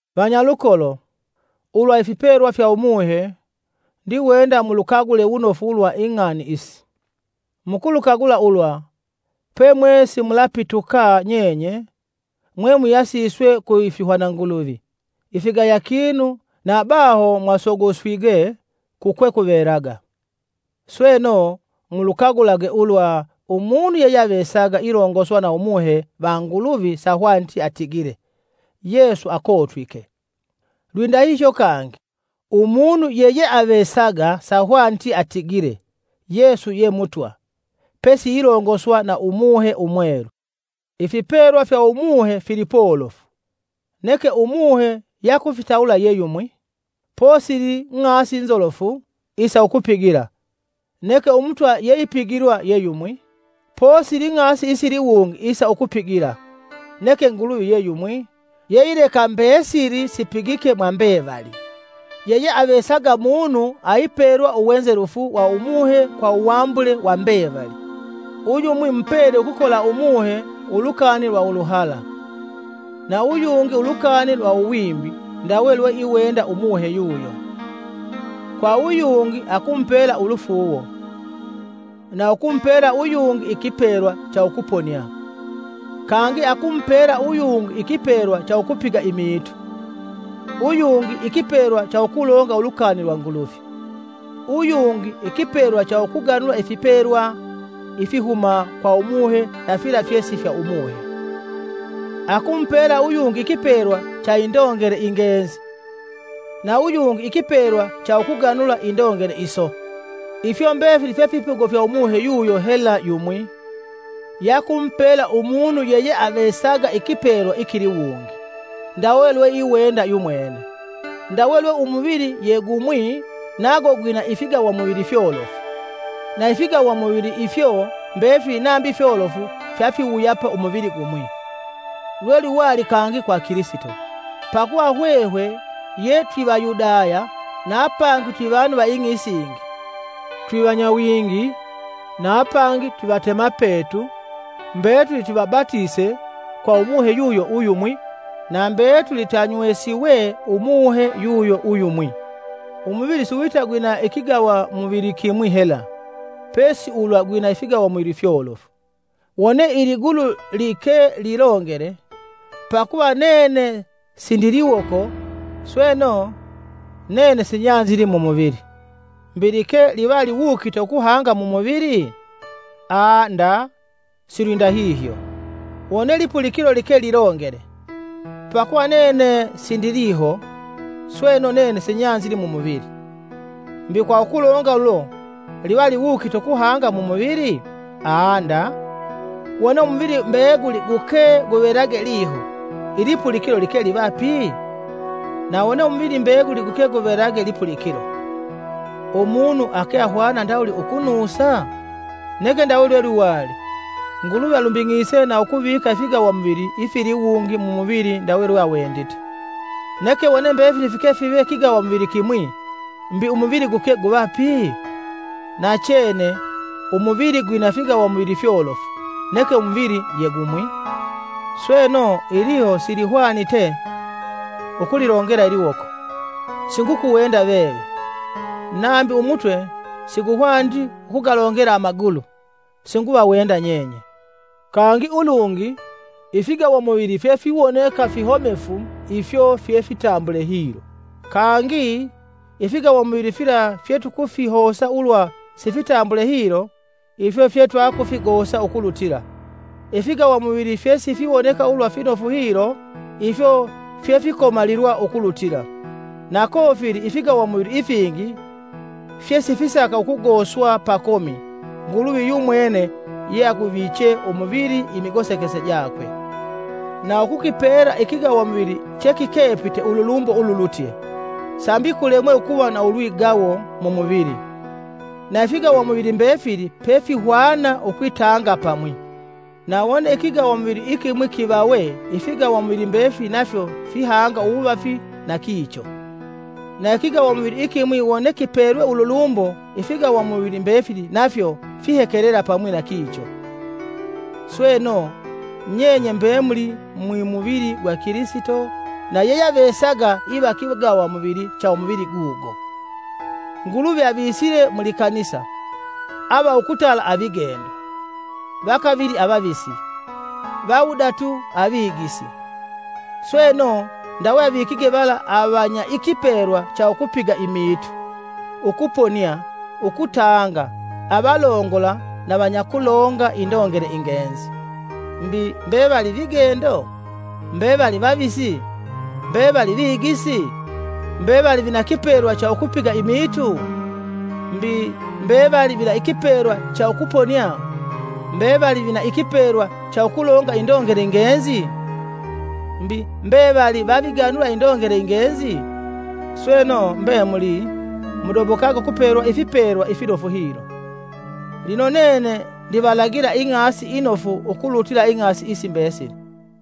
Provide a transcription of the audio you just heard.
Vanyalukolo, ulwa ifipelwa fya Umuhe, ndiwenda mulukagule wunofu ulwa ing'ani isi: Mukulukagula ulwa, pemwe simulapituka nyenye, mwemuyasiswe kuifihwananguluvi ifigaya kinu nabaho mwasogoswige kukwekuvelaga. Sweno, mulukagulage ulwa umunu yeyeavesaga ilongoswa na Umuhe va Nguluvi sahwaniti atigile, “Yesu akotwike!” Lwindahihyo kangi, umunu yeyeavesaga sahwaniti atigile: “Yesu ye Mutwa.” pesiilongoswa na Umuhe Umwelu. Ifipelwa fya Umuhe fili polofu, neke Umuhe yakufitawula ye yumwi. Posili ng'asi nzolofu isa ukupigila, neke Umutwa yeipigilwa ye yumwi. Posili ng'asi isiliwungi isa ukupigila, neke Nguluvi ye yumwi, yeileka mbesili sipigike mwa mbevali. Yeyeavesaga munu aipelwa uwenzelufu wa Umuhe kwa uwambule wa mbevali. Uyumwi mupele ukukola Umuhe, ulukani lwa uluhala, na uyungi ulukani lwa uwimbi ndawe lweiwenda Umuhe yuyo. Kwa uyungi akumupela ulufuuwo, na ukumupela uyungi ikipelwa cha ukuponia; Kangi akumupela uyungi ikipelwa cha ukupiga imiitu, uyungi ikipelwa cha ukulonga ulukani lwa Nguluvi, uyungi ikipelwa cha ukuganula ifipelwa ifihuma kwa Umuhe na fila fyesi fya Umuhe; akumupela uyungi ikipelwa cha indongele ingenzi na uyungi ikipelwa cha ukuganula indongele iso. Ifyo mbefili fye fipigo fya Umuhe yuyo hela yumwi, yakumupela umunu yeyeavesaga ikipelwa ikiliwungi, ndawe lweiwenda yumwene. Ndawe lwe umuvili ye gumwi nago gwina ifigawamuvili fyolofu, na ifigawa muvili ifyo mbefili nambi fyolofu-fyafiwuyapa umuvili gumwi, lwelwiwali kangi kwa Kilisito. Pakuva hwehwe, yetwi Vayudaya na apangi twivanu va ing'i isingi, twivanyawingi na apangi twivatemapetu, mbetuli twivabatise kwa Umuhe yuyo uyumwi; na mbetuli twanywesiwe Umuhe yuyo uyumwi. Umuvili siwita gwina ikigawamuvili kimwi hela, pesi ulwa gwina ifigawamuvili fyolofu. Wone iligulu like lilongele; “Pakuva nene sindi liwoko, sweno, nene sinyanzili mu muvili.” Mbi like livaliwukite ukuhanga mu muvili? Aa nda silwindahihyo! Wone lipulikilo like lilongele, “Pakuva nene sindi liho, sweno, nene sinyanzili mu muvili.” Mbi, kwa ukulonga ulo liva liwukite ukuhanga mu muvili? Aa nda! Wone umuvili mbeguli guke guvelage liho, ilipulikilo like liva pi? Na wone umuvili mbeguli guke guvelage lipulikilo, umunu ake ahwana ndawuli ukunusa? Neke ndawe lwelwiwali, Nguluvi alumbing'ise na ukuvika ifigawamuvili ifiliwungi mu muvili ndawe lweawendite. Neke wone mbefili fike five kigawamuvili kimwi, mbi, umuvili guke guva pi? Nachene, umuvili gwina figawamuvili fyolofu, neke umuvili ye gumwi. Sweno, iliho silihwanite ukulilongela iliwoko: “Singukuwenda veve”, nambi umutwe siguhwaniti ukugalongela amagulu: “Singuvawenda nyenye.” Kangi ulungi, ifigawamuvili fyefiwoneka fihomefu ifyo fyefitambule hilo. Kangi, ifigawamuvili fila fyetukufihosa ulwa sifitambule hilo, ifyo fyetwakufigosa ukulutila; ifigawamuvili fyesifiwoneka ulwa finofu hilo, ifyo fyefikomalilwa ukulutila, na kofili ifigawamuvili ifingi fyesifisaka ukugoswa pakomi Nguluvi yumuwene yeaguviche umuvili imigosekese jakwe, na ukukipela ikigawamuvili chekikepite, ululumbo ululutye, sambi kulemwe ukuva na ulwigawo mumuvili, na ifigawamuvili mbefili pefihwana ukwitanga pamwi. Na wone ikigawamuvili ikimwi kivawe ifigawamuvili mbefili nafyo fihanga uwuvafi na kicho. Na ikigawamuvili ikimwi wone kipelwe ululumbo ifigawamuvili mbefili nafyo fihekelela pamwi na kicho. Sweno, nyenye mbemuli mwi muvili gwa Kilisito na yeyeavesaga iva kigawamuvili cha umuvili gugo. Nguluvi avisile mu likanisa: ava ukutala avigendo, va kavili avavisi, va wudatu avigisi, sweno ndawe avikige vala avanya ikipelwa cha ukupiga imiitu, ukuponia, ukutanga, avalongola na vanyakulonga indongele ingenzi. Mbi, mbevali vigendo? Mbevali vavisi? Mbevali vigisi? Mbevali vina kipelwa cha ukupiga imiitu? Mbi, mbevali vina kipelwa cha ukuponia? Mbevali vina ikipelwa cha ukulonga indongele ingenzi? Mbi, mbevali vaviganula indongele ingenzi? Sweno mbemuli, mudobokage ukupelwa ifipelwa ifinofu hilo. Lino nene ndivalagila ing'asi inofu ukulutila ing'asi isi mbesili.